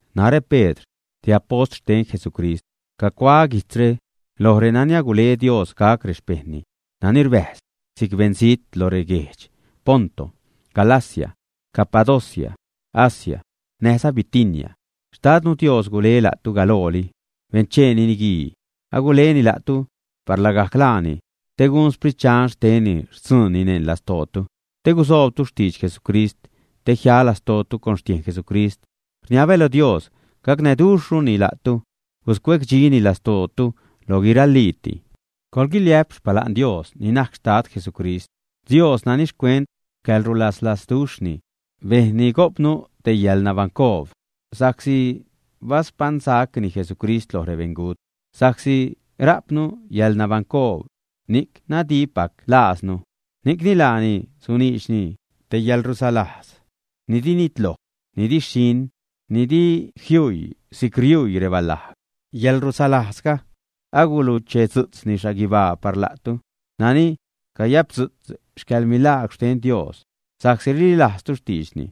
Narä Pedr, te apost xten Jesucrist, cacuaä guijtzre loj renani agule Dios gac rexpejṉni nani rbäjz si'c beṉzijt lo reguedx Ponto, Galacia, Capadocia, Asia, näjza Bitinia. Xtadnu Dios gule la'tu galooli bencheeni niguii, aguleni la'tu par lagajc laani te gun Sprit Dxan xtenni xtzuunni neṉ lastootu te gusoobtu xtidx Jesucrist te jia lastootu con xtiejn Jesucrist. Rniabä lo Dios gacnäduxhruni la'tu, guscuecdxini lastootu lo guiraliiti. Coḻguiliä'p xpala'n Dios ni najc Xtad Jesucrist, Dios nani xcuent xcäḻrulaslazduxhni bejnni gojpnu te yäḻnabaṉcoob sa'csi baspaṉsacni Jesucrist loj rebeṉgut. Sa'csi rajpnu yälnabaṉcoob, ni'c nadippac lajznu. Ni'cni laani suniidxni te yäḻrusalajz ni di nitloj, ni di xhiṉ, ni di jiuii si'c riuii rebalajg. Yäḻrusalajzga aguluchedzu'tzni xhaguibaa par la'tu, nani cayapdzu'tz xcäḻmilaagwr xten Dios sa'csi rililajztu xtiidxni,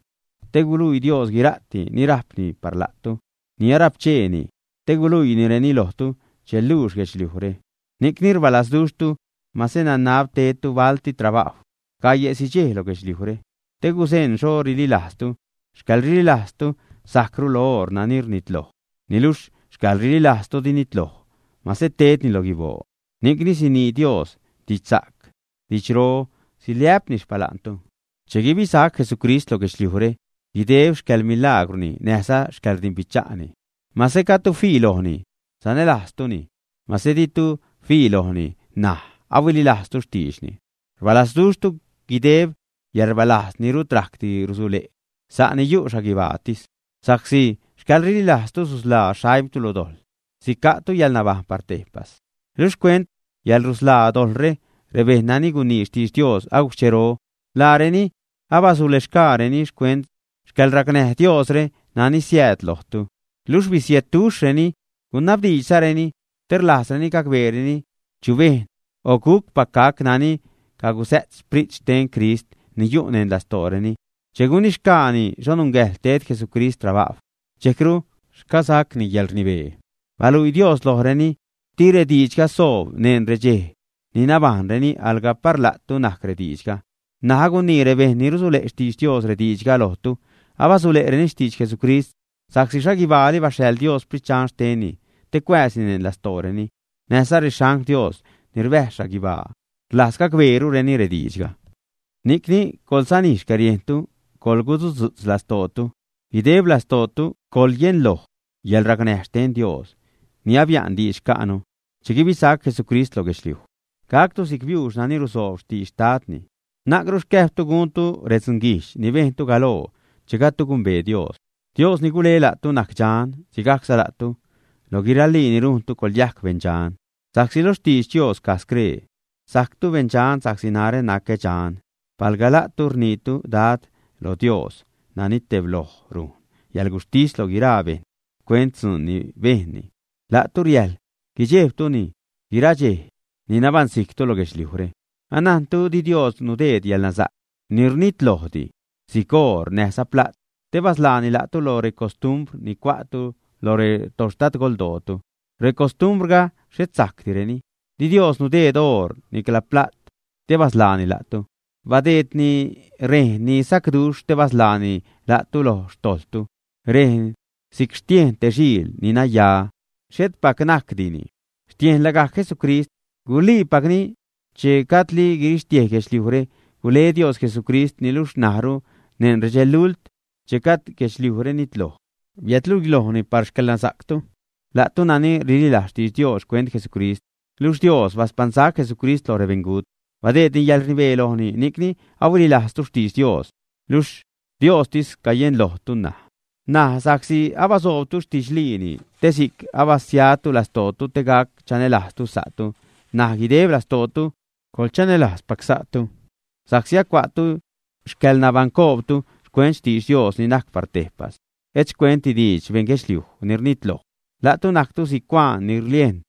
te guluii Dios guira'ti ni rajpni par la'tu, ni arapcheeni te guluiinireni lojtu che luux guedxliujre. Ni'cni rbalazduxhtu, mase nanab tedtu balti trabajw gaie'si dxej lo guedxliujre, te guzeṉ xho rililajztu. Xcäḻrililajztu sajcru lo oor nani rnitloj, niluxh xcäḻrililajztu di nitloj, mase tedni lo guiboo, ni'cni sinii Dios didxsa'c, didxro, siliä'pni xpala'ntu che guibisac Jesucrist lo guedxliujre guideb xcäḻmilaagwrni, näjza xcäḻrdimbicha'ni. Mase gajdtu fii lojni, sanälajztuni. Mase ditu fii lojni ṉaj, ahuililajztu xtiidxni, rbalazduxhtu guideb yäḻrbalajz ni rut rajcdi rusule', sa'ni yu' xhaguibaatis, sa'csi xcäḻrililajztu susḻaa xaimtu lo dojḻ, sica'tu yäḻnabajṉ par tejpas. Luxh xcuent yäḻrusḻaa dojḻre, rebejṉ nani gunii xtidx Dios agujc xchero, laareni abasulexgaareni xcuent xcäḻracnäj Diosre nani siääd lojtu. Luxh bisiedduxhreni, gunabdiidxzareni, te rlajzreni gacbeereni chu bejṉ o gucpac gac nani cagusä't Sprit xten Crist ni yu' neṉ lastooreni che gunixgaani xho nungäjḻ ted Jesucrist trabajw, dxejcru xcasacni yäḻrnibee. Baluii Dios lojreni, di rediidxga soob neṉ redxej ni nabajṉreni, alga par la'tu najc rediidxga. N̲aj agunii rebejṉ ni rusule' xtidx Dios rediidxga lojtu. Abasule'reni xtidx Jesucrist sa'csi xhaguibaali baxhaḻ Dios Sprit Dxan xtenni te cuääzni neṉ lastooreni. Näjza rexangl Dios ni rbäjz xhaguibaa rlajz gacbeerureni rediidxga. Ni'cni, coḻsanij xcäriejntu, coḻgusudzu'tz lastootu, guideb lastootu coḻyenloj yäḻracnäj xten Dios ni abia'n diidx xca'nu che guibisac Jesucrist lo guedxliuj. Gactu si'c biuux nani rusoob xtidx xtadni. Na'cru xcäjbtu guntu redzunguijdx ni bejntu galoo che gajdtu gumbee Dios. Dios ni gule la'tu najc dxan. Sigajcza la'tu, loj guiralii ni rujntu coḻyajc beṉdxan. Sa'csi lo xtidx Dios caj scree: “Sajctu beṉdxan sa'csi narä nacä dxan.” Palga la'tu rniitu “Dad” lo Dios nani tebloj rujn yäḻguxhtis loj guiraa bejṉ xcuent dzuun ni bejnni, la'tu riäjl guidxejbtuni guiraa dxej ni nabaṉsijctu lo guedxliujre. Anajntu di Dios nudeed yäḻnasa'c ni rnitlojdi, si'c oor näjza pla't, te basḻaani la'tu lo recostumbr ni cua'tu lo retoxtadgoldootu. Recostumbrga xhet sa'cdireni. Di Dios nudeed oor nicla pla't te basḻaani la'tu, badeedni rejn ni sacduxh te basḻaani la'tu loj xtojḻtu. Rejn si'c xtiejn te xiil ni naya, xhetpac najcdini, xtiejn lagajc Jesucrist. Guliipacni che gajdli guirixtiej guedxliujre, gule Dios Jesucrist, niluxh ṉajru, neṉ redxelult che gajd guedxliujre nitloj, biädluilojni par xcäḻnasa'ctu, la'tu nani rililajz xtidx Dios xcuent Jesucrist. Luxh Dios baspaṉsac Jesucrist loj rebeṉgut, badeedni yäḻrnibee lojni, ni'cni ahuililajztu xtidx Dios, luxh Diostis cayenlojtu ṉaj. N̲aj sa'csi abasoobtu xtidxliini, te si'c abasiatu lastootu te gac chanälajztu sa'tu, ṉaj guideb lastootu coḻchanälajzpac sa'tu. Sa'csi acua'tu xcäḻnabaṉcoobtu xcuent xtidx Dios ni najc par tejpas, et xcuentdi xtidx beṉ guedxliuj ni rnitloj. La'tu najctu si'c cuaan ni rliejn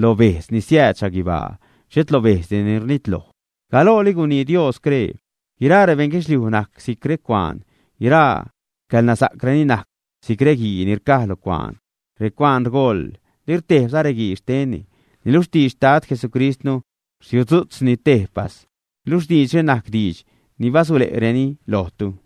lo bejdz ni siääd xhaguibaa, xhet lo bejdzdi ni rnitloj. Galooli gunii Dios scree: Guiraa rebeṉ guedxliuj najc si'c recuaan, guiraa xcäḻnasa'creni najc si'c reguii ni rcaj lo cuaan, recuaan rgoḻ, lirtejbza reguii xtenni, niluxh xtidx xtad Jesucristnu rsiudzu'tzni tejpas. Luxh diidxre najc diidx ni basule'reni lojtu.